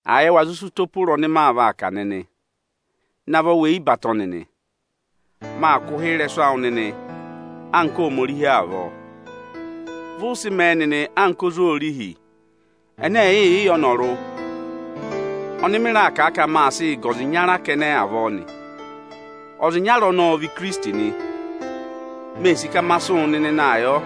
Àa yẹ wa zụ sị ụtọ pe ụra ọnị maa vaa kà nịnị aanị! Navọ weyi batọ nịnị! Maa kụ̀ ụhị ịrẹsụ awụ nịnị anka Ohomorihi avọọ. Vị ụ sị mẹẹ nịnị anka ozwoorihi ẹnẹ ẹ̀ẹẹ̀ yị yẹ ọnọrụ ọnị mị raà kà a ka maa sịị gà ọza ịnyara kẹnẹ avọọ nị. Ọza ịnyara ọnọọ ọ vị Ikirisiti nị. Mee sì ka ma sị wụ nịnị naa yọ.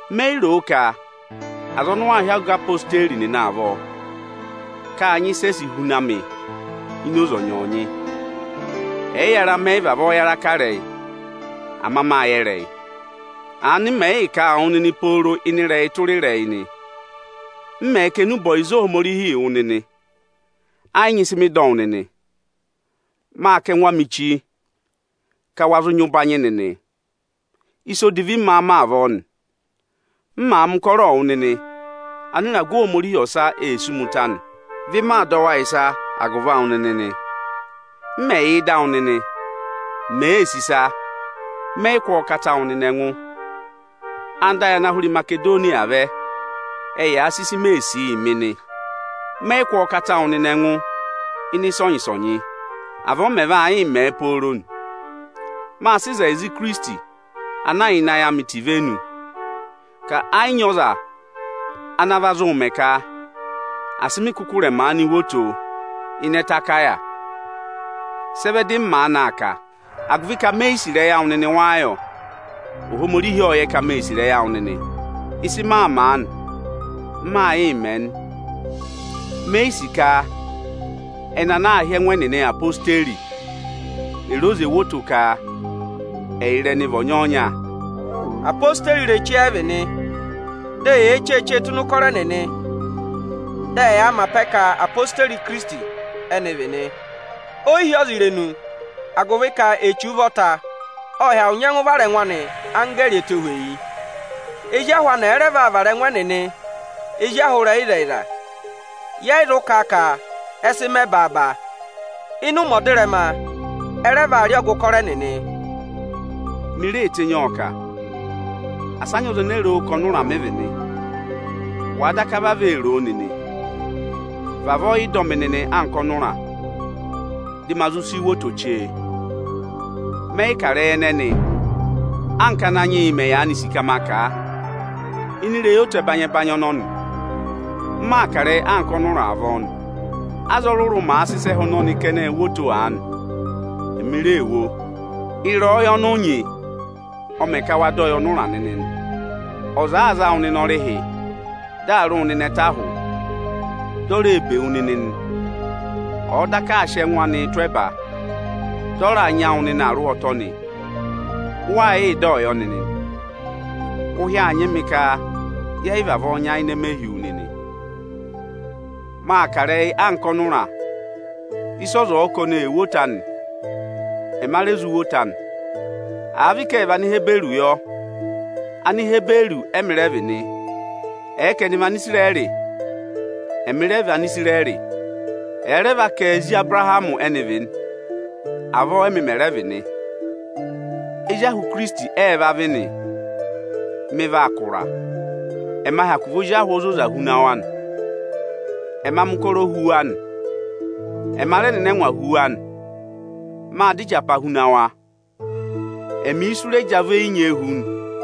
Me yi ro ka aza ọnị ụ waa hị́ ọga ezirẹma Ijeesu nịnị avọọ, ka â nyị ịsị e si huna mị ini oze ọnyọọnyị. Ẹyịyara, mẹ yị vavọọ yara kà ịrẹyị, ama mâ yẹ ịrẹyị. Aanị m mẹ̀ yịị kà a wụ nịnị pooro ịnị ịrẹyị tụra ịrẹyị nị. M mẹ̀ kà enube ọyịza Ohomorihi yị wụ nịnị, ẹ yị nyị ịsị mị dọ wụ nịnị. Mâ kà ẹngụ amị chi, ka wa zụ nyị ụbanyị nịnị. Ịsa odivi m máá mẹ avọọ nị? M màa mẹ ụkọrọọ wụ nịnị, anịragụ Ohomorihi ọsa ee sí mi ụta nị. Vị maa dọ wa ịsa agụvị awụ nịnị nị. M mẹ̀ yà ịdị awụ nịnị, mèee sì ịsa, mẹ yị kụ́ ọọ kata wụ nịnị ẹngụ. Anda ayị ana hụ rẹ Imasedoniya vẹ, ẹ́ yaa sị ịsị mèe sì yị mị nị. Mẹ yị kụ́ ọọ kata wụ nịnị ẹngụ ịnị ẹngụ ịnị ịsọnyị-ịsọnyị. Avọọ m mẹ̀ yị vaa mẹ pooro nị. Mâ sị ịzẹyịza Ikirisiti, ana yà ịnị ayị amị ta ivenu, ka ẹ yị nyị ọza ana va zụụ mẹ ka asị mị kụkụ rẹ̀ maanị wo oto ịnị ẹtẹ Akaya. Sị ẹ vẹ dị mị maanị aa kà? Agụvị ka me yi sì ịrẹyị awụ nịnị wáá yọ? Ohomorihi ộ yẹ ka mee sì ịrẹyị awụ nịnị. Ịsị mị mẹ aanị, m maa yịị mẹ nị. Me yi sì ka ẹnị ana aā hị́ ẹngụ ẹnịnị ezirẹma Ijeesu, è re oze wo oto ka ẹyịrị ẹnị vị ọnyọọnya. Ezirẹma Ijeesu ireche ẹ vị nị, dị eyee cheechee tụ́ ịnị ụkọrọ ẹnịnị nị. Dị ẹyaa mẹ apẹ ka ezirẹma Ijeesu ẹnị vị nị. O yi hi ọza irenu, agụvị ka Echu ụvọta ộ hyakụ nyẹngụ vara ẹngụ anị anggẹẹrị ẹtohweyi. Ezi ahụ anị ẹ̀ẹ rẹ vaa vara ẹngụ ẹnịnị ezi ahụ ịrẹyịzẹyịza, yẹ yị zụ kà ka ẹ sị mẹ baaba. Ịnị ụmẹ ọdịrẹma, ẹ rẹ vaa rị ọgụ ụkọrọ ẹnịnị. Mi ree tenyi ọọ kà; asị ọza ene ro o ka ọnụra mị vị nị. Wàa daka vavọọ ee ro o nịnị, vavọọ yị dọ mị nịnị anka ọnụra, dị me zụ si wo oto chee. Mẹ yị kà ịrẹyị ẹnẹnị anka Ananyị yị mẹ̀ yaanị sì ka ma kà a. Ịnị ịrẹyị oto ẹbanyị-ẹbanyị ọnọnị, m maa kà ịrẹyị anka ọnụra avọọ nị. Aza ọrụrụ-ọrụrụ màa sị ịsa ẹhẹ ọnọnịị wo oto aanị, ẹmị ree wo. Ịrẹyọyẹ ọnị ụ nyị nịnị, ọ mè ka wa dọ yị ọnụra nịnị nị. Ọza àaa za wụ nịnị ọrịhị, dị aa rị wụ nịnị ẹtẹ ahụ, di o ree bè wu nịnị nị, ọ̀ọ daka aa sị ẹngụ anịị tụ́ ẹba dị ọ raa nyị awụ nịnị arụhwọtọ nị, wa yị dọ yọ nịnị. Ụhị aa nyị mị ka yẹ yị vavọọ nyayịnẹ mẹ hi wu nịnị. Maa kà ịrẹyị anka ọnụra; ịsị ọza ọ̀ọ ka oni ee wo oto anị, ẹma re zụ wo oto anị. Àa vị ka ệ vị Anihiburu yọ, Anihiburu ẹmị rẹ vị nị. Ẹ̀ẹ ka ẹnị vị Anisirẹrị, ẹmị rẹ vị Anisirẹrị. Ẹ̀ẹ rẹ va ka ezi Abụrahamị ẹnị vị nị, avọọ ẹmị mẹ̀ rẹ vị nị. Ezi ahụ Ikirisiti ẹ ẹ́ẹ́ va vị nị? Mị vaa kà ụra, ẹ ma hyakụ vị ozi ahụ ozoza huna wa nị. Ẹma mẹ̀ ụkọrọ hu wa nị; ẹma rẹ nọ ịnị ẹngwa hu wa nị. Mâ dọ ịjapa huna wa, ẹmị isu rẹ jị ọ avọ eyi nyee hu nị.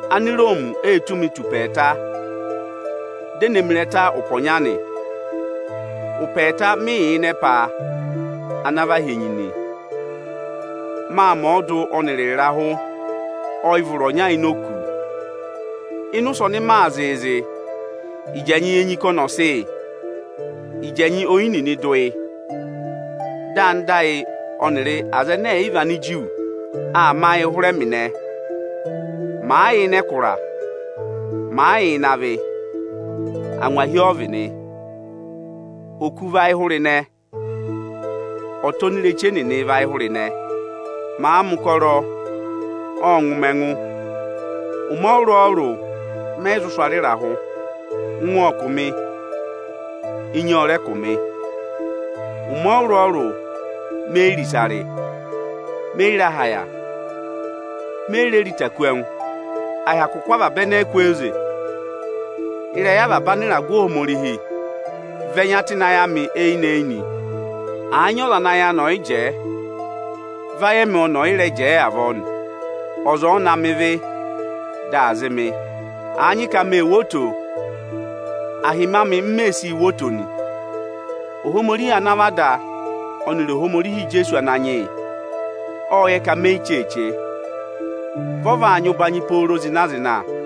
Aniroomi ê tụ́ mi tù ụpẹ ẹẹta, dị ẹ kụ̀ mị ịrẹta ụpẹ ọnya nị. Ụpẹ ẹẹta mị yà ịnị ẹpa ana và hi enyi nị. Mâ mẹ ọọdụ ọnịrị ịrahụ ọyịvụrụ ọnya ini òkū. Ịnị ụsẹ ọnị yaa zịịzị, ịjị ẹnyị enyi ka ọnị ọ̀ kụ́ yị, ịjị ẹnyị oyi dụ yị. Dị anda ayị ẹnịrị Anigiriki aa mẹ ayị hụrẹ ẹmị ịnẹ. Màa yà ịnị ẹkụra, màa yà ịnị avị, angwahi ọ vị nị. Oku vị ayịhụrịnẹ ọta onireche nịnị vị ayịhụrịnẹ. Mâ mẹ̀ ụkọrọ, ộ ngụ mị ẹngụ. Ụmẹ ọrụrụ-ọrụrụ mẹ yị sụ̀ ara ịrahụ. Ụngwẹ ộ kụ̀ mị, enyi ọ rẹ kụ̀ mị. Ụmẹ ọrụrụ-ọrụrụ me yi re ịsa rị, me yi re aha yà, me yi re ịta kú ẹngụ. À hyakụ kụ́ avaba ẹnẹ ẹ kwooze, ịrẹyị avaba anịragụ Ohomorihi vị ẹnya tụ́ ịnị ayị amị eyinị-eyinị. Àa nyị ọza ana ayị anị ọ̀ yị jẹẹ, vị ayị ẹmị ọnị ọ̀ yị rẹ jẹẹ avọọ nị. Ọza ọ̀ọ na mẹ ịvị, dị aa zị mị. Àa nyị ka mee wo oto, ahịmị amị m mee sii wo oto nị. Ohomorihi ana vị Ada Ijeesu Ananyị yị, ộ yẹ ka me yi cheeche. Ọnị ọ nyị avaba ụbanyị pooro zịna-zịna nị.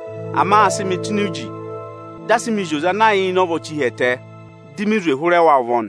Ama â sị mị tụ́ ini uji, dị a sị mị zị oze ana yà ịnị ọvọ chi hi ẹtẹ, di mi zwe hụrẹ wa ụvọ nị.